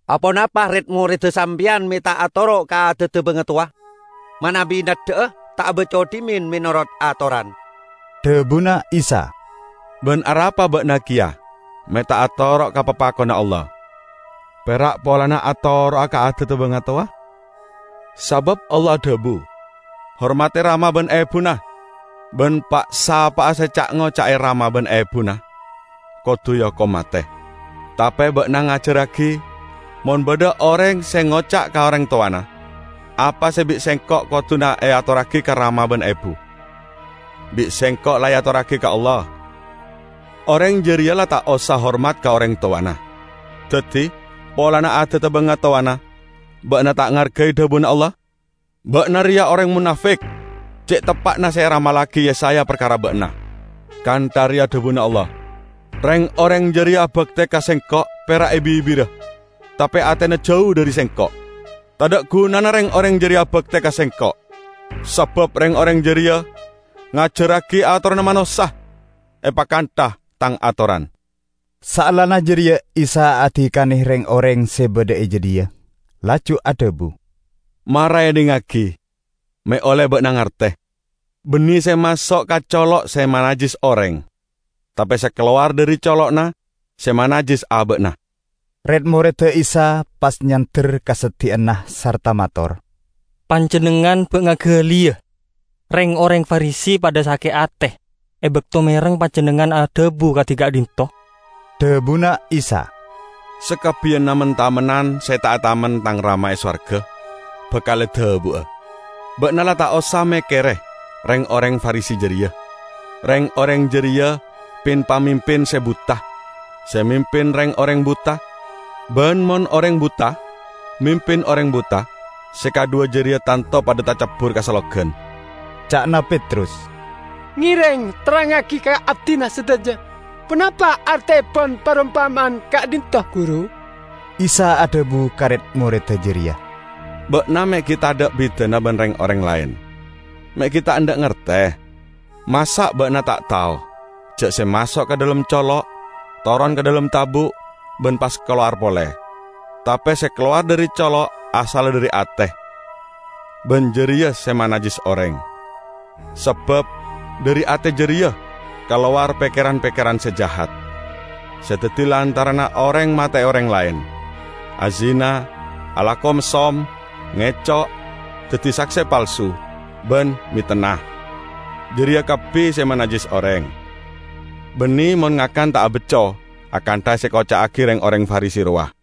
"Aponapa red-moredda sampeyan me' ta' atoro' ka adadda bangatowa? Manabi neddha'a, ta' abacco dhimen menorot atoran!" Dhabuna Isa, "Ban arapa ba'na keya me' ta' atoro' ka papakonna Allah, pera' polana atoro'a ka adadda bangatowa? Sabab Allah adhabu, 'Hormadi rama ban ebuna,' ban 'Pa'-sapa'a se ca'-ngoca'e rama ban ebuna, kodu eokom mate.' Tape ba'na ngajarragi: mon badha oreng se ngoca' ka oreng towana, 'Apa se bi' sengko' koduna eatorragi ka rama ban ebu, bi' sengko' la eatorragi ka Allah,' oreng jareya la ta' osa hormat ka oreng towana. Daddi, polana adadda bangatowana ba'na ta' ngargai dhabuna Allah. Ba'na reya oreng monafik! Ce' teppa'na se eramallagi Yesaya parkara ba'na, 'Kantha reya dhabuna Allah: Reng-oreng jareya abakte ka Sengko' pera' e bibirra, tape atena jau dhari Sengko'. Tadha' gunana reng-oreng jareya abakte ka Sengko', sabab reng-oreng jareya ngajarragi atoranna manossa epakantha Tang atoran.' " Saellana jareya Isa adikane reng-oreng se badha e jadhiya; laju adhabu, "Mara edhingngagi me' olle ba'na ngarte! Banne se maso' ka colo' se manajjis oreng; tape se kalowar dhari colo'na se manajjis aba'na." Red-moredda Isa pas nyander ka seddi'anna sarta mator, "Panjennengngan ba' ngagaliya reng-oreng Farisi padha sake' ate e bakto mereng Panjennengngan adhabu kadi ka'dhinto'?" Dhabuna Isa, "Sakabbiyanna men-tamennan se ta' etamen Tang Rama e sowarga bakal edabu'a. Ba'na la ta' osa mekkere reng-oreng Farisi jareya. Reng-oreng jareya pin-pamimpin se buta, se mimpin reng-oreng buta; ban mon oreng buta mimpin oreng buta, se kadhuwa jareya tanto padha tacabbur ka sellogan." Ca'na Petrus, "Ngereng terrangngagi ka abdina sadaja ponapa arteepon parompama'an ka'dhinto', Guru." Isa adhabu ka red-moredda jareya, "Ba'na me' gi' tadha' bidana ban reng-oreng laen, me' gi' ta' endha' ngarte. Masa' ba'na ta' tao, ja' se maso' ka dhalem colo' toron ka dhalem tabu' ban pas kalowar pole? Tape se kalowar dhari colo' asalla dhari ate, ban jareya se manajjis oreng. Sabab dhari ate jareya kalowar pekkeran-pekkeran se jahat, se daddi lantaranna oreng mate'e oreng laen, azina, alako messom, ngeco', daddi sakse palsu ban metenna. Jareya kabbi se manajjis oreng, banne mon ngakan ta' abacco akantha se ekoca'agi reng-oreng Farisi rowa."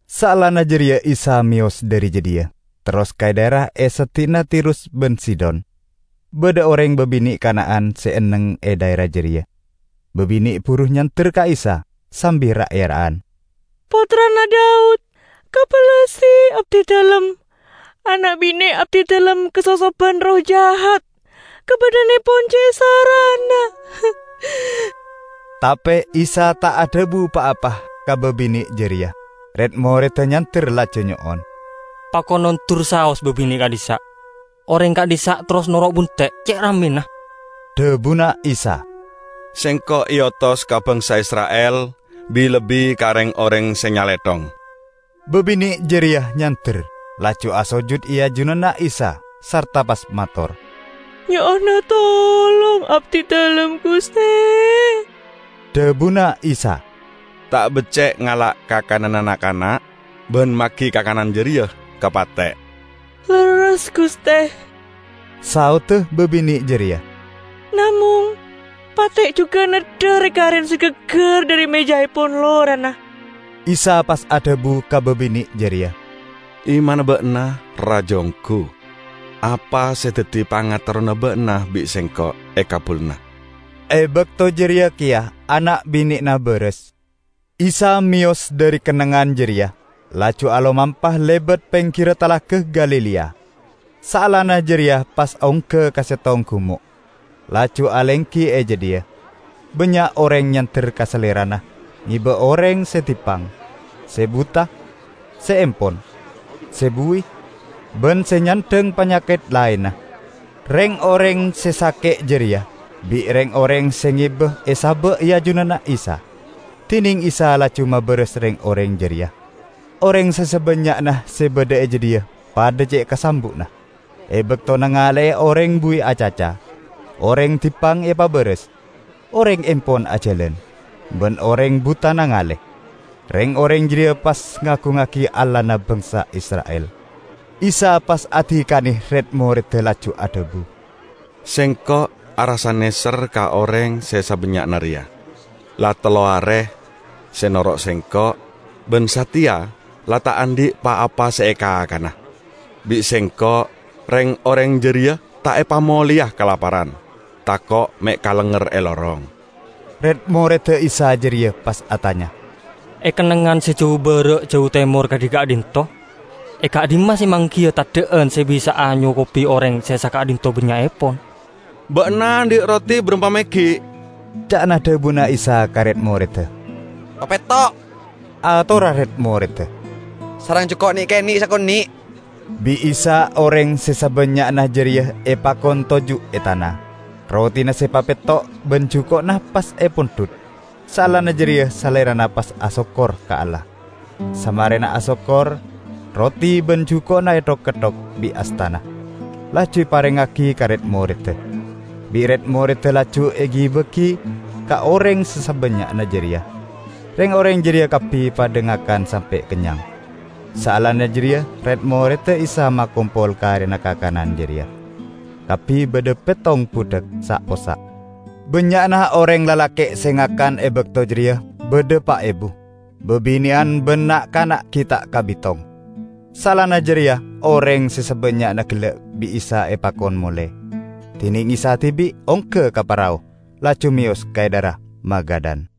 Saellana jareya Isa meyos dhari jadhiya terros ka dhaera e seddi'na Tirus ban Sidon. Badha oreng babine' Kana'an se enneng e dhaera jareya; babine' buru nyander ka Isa sambi ra'-era'an, "Pottrana Daud, kabellasi abdidalem! Ana' bine' abdidalem kasosoban erroh jahat. Kabadha'annepon ce' sarana." Tape Isa ta' adhabu pa-apa ka babine' jareya. Red-moredda nyander laju nyo'on, "Pakon ondur saos babine' ka'dhissa'! Oreng ka'dhissa' terros noro' bunte' ce' rammena!" Dhabuna Isa, "Sengko' eotos ka bangsa Isra'il, bi-lebbi ka reng-oreng se nyalethong." Babine' jareya nyander, laju asojud e ajunanna Isa sarta pas mator, "Nyo'ona tolong abdidalem, Guste." Dhabuna Isa, "Ta' becce' ngala' kakananna na'-kana' ban magi kakanan jareya ka pate'." "Lerres, Guste," saodda babine' jareya, "namong pate' jugan neddha re-kare se gaggar dhari mejaepon lorana." Isa pas adhabu ka babine' jareya, "Imanna ba'na raja onggu! Apa se daddi pangaterrona ba'na bi' Sengko' ekabbulana." E bakto jareya keya ana' bine'na baras. Isa meyos dhari kennengngan jareya, laju alomampa lebat peggirra Talaga Galilea. Saellana jareya pas ongga ka settong gumo' laju alenggi e jadhiya. Bannya' oreng nyander ka Salerana ngeba oreng se dippang, se buta, se empon, se buwi ban se nyandhang panyaket laenna. Reng-oreng se sake' jareya bi' reng-oreng se ngeba esaba' e ajunanna Isa, dineng Isa laju mabaras reng-oreng jareya. Oreng se sabannya'na se badha e jadhiya padha ce' kasambu'na, e bakto nangale'e oreng buwi acaca, oreng dippang epabaras, oreng empon ajalan, ban oreng buta nangale. Reng-oreng jareya pas ngagungngagi Allahna bangsa Isra'il. Isa pas adikane red-moredda laju adhabu, "Sengko' arassa neser ka oreng se sabannya'na reya. La tello are se noro' Sengko', ban sateya la ta' andhi' pa-apa se ekakana. Bi' Sengko' reng-oreng jareya ta' epamoleya kalaparan, tako' me' kalengnger e lorong." Red-moredda Isa jareya pas atanya, "E kennengngan se jau bara' jau temor kadi ka'dhinto', e ka'dhimma se manggiya teddha'an se bisa'a nyokobi oreng se saka'dhinto bannya'epon?" "Ba'na andhi' roti barampa meggi'?" ca'na dhabuna Isa ka red-moredda. "Papetto'," atorra red-moredda, "sareng juko' ne'-kene' sakone'." Bi' Isa oreng se sabannya'na jareya epakon toju' e tana. Rotina se papetto' ban juko'na pas epondhut, saellana jareya Salerana pas asokkor ka Allah. Samarena asokkor roti ban juko'na ethok-ketthok bi' astana, laju eparengngagi ka red-morreda. Bi' red-moredda laju egi-bagi ka oreng se sabannya'na jareya. Reng-oreng jareya kabbi padha ngakan sampe' kennyang. Saellana jareya red-morreda Isa makompol karena kakanan jareya. Kabbi badha pettong budhak sa'-possa'. Bannya'na oreng lalake' se ngakan e bakto jareya badha pa' ebu, babine'an ban na'-kana' gi' ta' kabitong. Saellana jareya oreng se sabannya'na gella' bi' Isa epakon mole. Dineng Isa dibi' ongga ka parao laju meyos ka dhaera Magadan.